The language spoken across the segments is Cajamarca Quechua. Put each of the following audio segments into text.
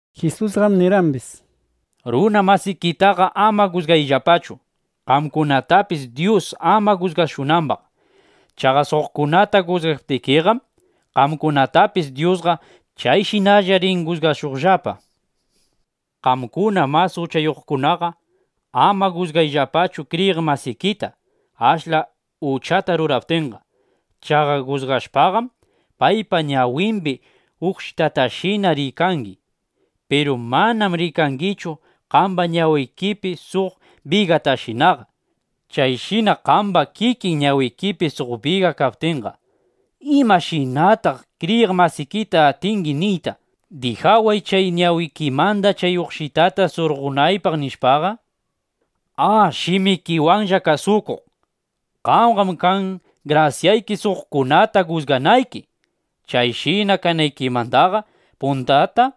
Jisusqam nirqambis: —Runa masikitaqa ama jusgayllapachu, qamkunatapis Dyus ama jusgashunambaq. Chaqa suqkunata jusgaptikiqam, qamkunatapis Dyusqa chayshinalla rin jusgashuqllapa. Qamkuna mas uchayuqkunaqa ama jusgayllapachu kriyiq masikita, ashla uchata ruraptinqa. Chaqa jusgashpaqam, paypa ñawimbi uqshitatashina rikangi. Piru manam rikangichu qamba ñawikipi suq bigatashinaqa. Chayshina qamba kikin ñawikipi suq biga kaptinqa, ¿imashinataq kriyiq masikita atingi niyta: “Dijaway chay ñawikimanda chay uqshitata surqonaypaq”, nishpaqa? ¡A, shimikiwanlla kasukuq! ¡Qambaqam kan grasyayki, suqkunata jusganayki! Chayshina kanaykimandaqa puntata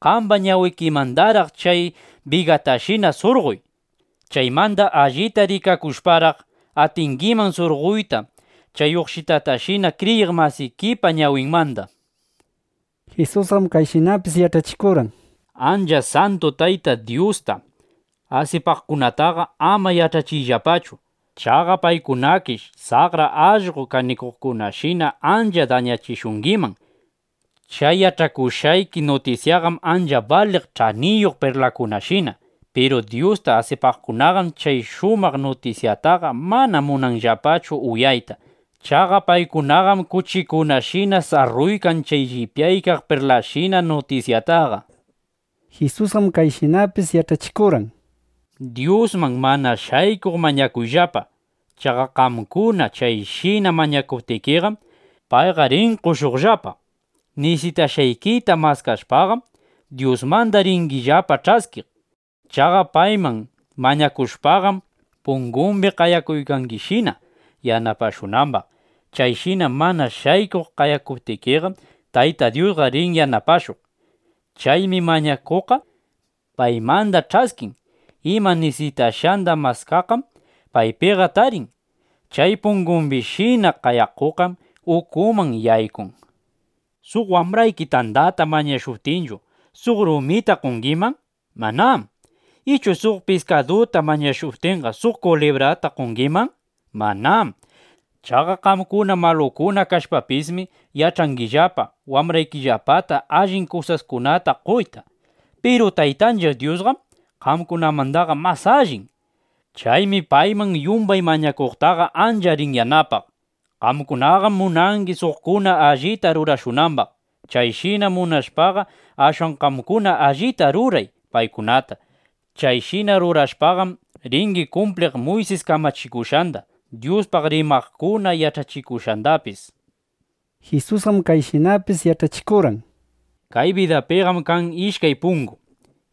qamba ñawikimandaraq chay bigatashina surqoy. Chaymanda allita rikakushparaq, atingiman surqoyta chay uqshitatashina kriyiq masikipa ñawinmanda. Jisusqam kayshinapis yach'achikurqan: —Ancha santu Tayta Dyusta asipaqkunataqa ama yach'achiyllapachu. Chaqa paykunakish saqra allqo kanikuqkunashina ancha dañachishungiman. Chay yach'akushqayki nutisyaqam ancha baliq ch'aniyuq perlaskunashina. Piru Dyusta asipaqkunaqam chay shumaq nutisyataqa mana munanllapachu uyayta. Chaqa paykunaqam kuchikunashina sarruykan chay llipyaq perlasshina nutisyataqa. Jisusqam kayshinapis yach'achikurqan: —Dyusman (mana shaykuq) mañakuyllapa. Chaqa qamkuna chayshina mañakuptikiqam, payqa rin qoshuqllapa. Nisitashqaykita maskashpaqam, Dyusmanda ringillapa ch'askiq. Chaqa payman mañakushpaqam, pungumbi qayakuykangishina, yanapashunambaq. Chayshina (mana shaykuq) qayakuptikiqam, Tayta Dyusqa rin yanapashuq. Chaymi mañakuqqa paymanda ch'askin; ima nisitashqanda maskaqqam paypiqa tarin; chay pungumbishina qayakuqqam ukuman yaykun. ’¿Suq wambrayki tandata mañashuptinchu, suq rumita qongiman? Manám. ¿Ichu suq piskaduta mañashuptinqa, suq kulibrata qongiman? Manám. Chaqa qamkuna malukuna kashpapismi, yach'angillapa wambraykillapata allin kusaskunata qoyta. Piru Taytanchiq Dyusqam qamkunamandaqa mas allin. ¡Chaymi payman yumbay mañakuqtaqa ancha rin yanapaq! ’Qamkunaqam munangi, suqkuna allita rurashunambaq. Chayshina munashpaqa, ashwan qamkuna allita ruray paykunata. Chayshina rurashpaqam, ringi kumpliq Muysis kamachikushqanda, Dyuspaq rimaqkuna yach'achikushqandapis. Jisusqam kayshinapis yach'achikurqan: —Kay bidapiqam kan ishkay pungu,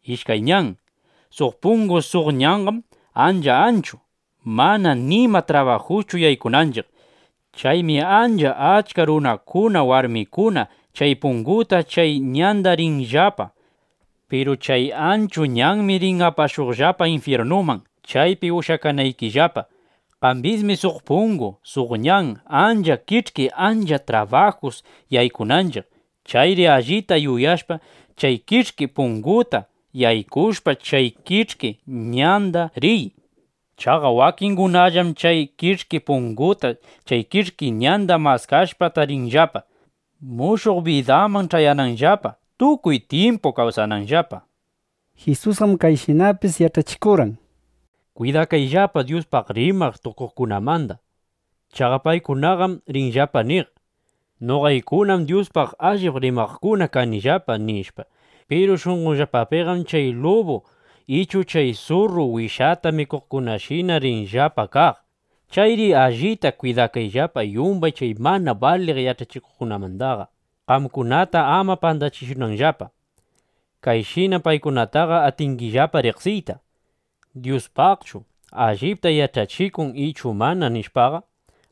ishkay ñan. Suq pungu, suq ñanqam ancha anchu, mana nima trabajuschu yaykunanchiq. Chaymi ancha achka runakuna, warmikuna chay punguta, chay ñanda riykanllapa. Piru chay anchu ñanmi rin apashuqllapa infyirnuman, chaypi ushyakanaykillapa. Kambismi suq pungu, suq ñan ancha kich'ki ancha trabajus yaykunanchiq. Chayri allita yuyashpa, chay kich'ki punguta yaykushpa, chay kich'ki ñanda riy. Chaqa wakingunallam chay kich'ki punguta chay kich'ki ñanda maskashpa tarinllapa, mushuq bidaman ch'ayananllapa, tukuy tyimpu kawsananllapa. Jisusqam kayshinapis yach'achikurqan: —Kwidakayllapa Dyuspaq rimaq tukuqkunamanda. Chaqa paykunaqam rinllapa niq: “Noqaykunam Dyuspaq allip rimaqkuna kanillapa”, nishpa. Piru shunqonllapapiqam chay lubu (ichu chay surru) wishata mikuqkunashina rinllapa kaq. Chayri allita kwidakayllapa yumbay chay mana baliq yach'achikuqmanda, qamkunata ama pandachishunanllapa. Kayshinam paykunataqa atingillapa riqsiyta: Dyuspaqchu allipta yach'achikun ichu mana, nishpaqa.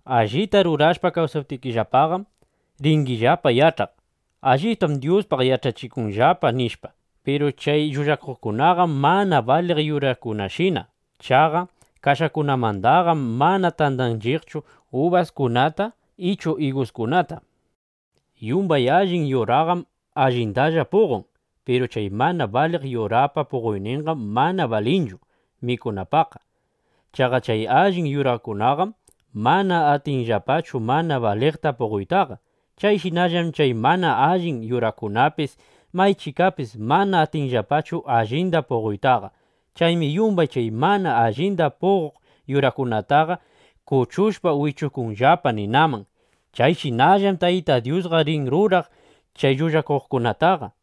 Allita rurashpa kawsaptinllapaqam, ringillapa yach'aq: Alliptam Dyuspaq yach'achikunllapa, nishpa. Piru chay llullakuqkunaqam mana baliq yurakunashina. Chaqa kashakunamandaqam mana tandanchiqchu ubaskunata ichu iguskunata. Yumbay allin yuraqam allindalla puqon. Piru chay mana baliq yurapa puqoyninqam mana balinchu mikunapaqqa. Chaqa chay allin yurakunaqam mana atinllapachu mana baliqta puqoytaqa. Chayshinallam chay mana allin yurakunapis maychikapis mana atinllapachu allinda puqoytaqa. Chaymi yumbay chay mana allinda puqoq yurakunataqa kuchushpa wichukunllapa ninaman. Chayshinallam Tayta Dyusqa rin ruraq chay llullakuqkunataqa.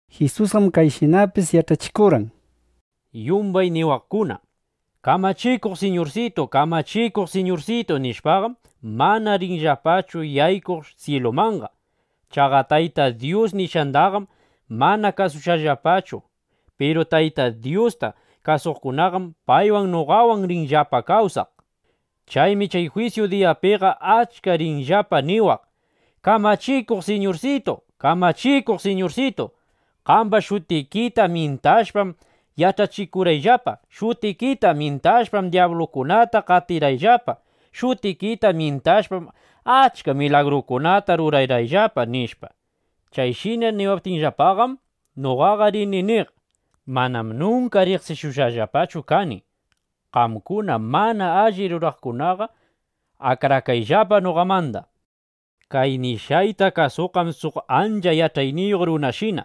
Jisusqam kayshinapis yach'achikurqan: —Yumbay niwaqkuna: “Kamachikuq Siñursitu, Kamachikuq Siñursitu”, nishpaqam, mana rinllapachu yaykuq syilumanqa. Chaqa Taytay Dyus nishqandaqam mana kasushqallapachu. Piru Taytay Dyusta kasuqkunam paywan, noqawan rinllapa kawsaqqa. Chaymi chay jwisyu diyapiqa achka rinllapa niwaq: “¡Kamachikuq Siñursitu, Kamachikuq Siñursitu, qamba shutikita myintashpam yach'achikurqayllapa! ¡Shutikita myintashpam, dyablukunata qatirqayllapa! ¡Shutikita myintashpam, achka milagrukunata rurarqayllapa!” nishpa. Chayshina niwaptinllapaqam, noqaqa rini niq: “Manam nunka riqsishushqallapachu kani. Qamkuna mana alli ruraqkunaqa akrakayllapa noqamanda.” ’Kay nishqayta kasuqqam suq ancha yach'ayniyuq runashina.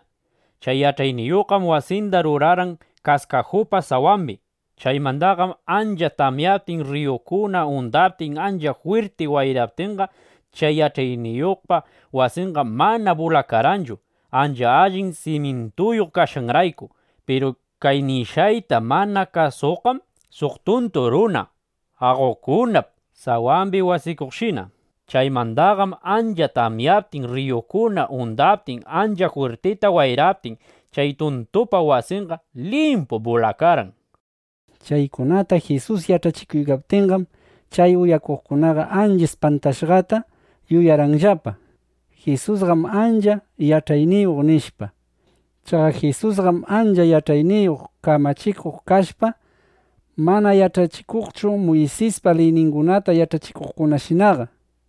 Chay yach'ayniyuqqam wasinda rurarqan kaskajupa sawambi. Chaymandaqam ancha tamyaptin, rriyukuna undaptin, ancha jwirti wayraptinqa, chay yach'ayniyuqpa wasinqa mana bulakarqanchu, ancha allin simyintuyuq kashqanrayku. Piru kay nishqayta mana kasuqqam suq tuntu runa aqokunap sawambi wasikuqshina. Chaymandaqam ancha tamyaptin, rriyukuna undaptin, ancha jwirtita wayraptin, chay tuntupa wasinqa limpu bulakarqan. Chaykunata Jisus yach'achikuptinqam, chay uyaqkunaqa ancha ispantashqata yuyarqanllapa: Jisusqam ancha yach'ayniyuq, nishpa. Chaqa Jisusqam ancha yach'ayniyuq kamachikuq kashpa, mana yach'achikuqchu Muysispa liyningunata yach'achikuqkunashina.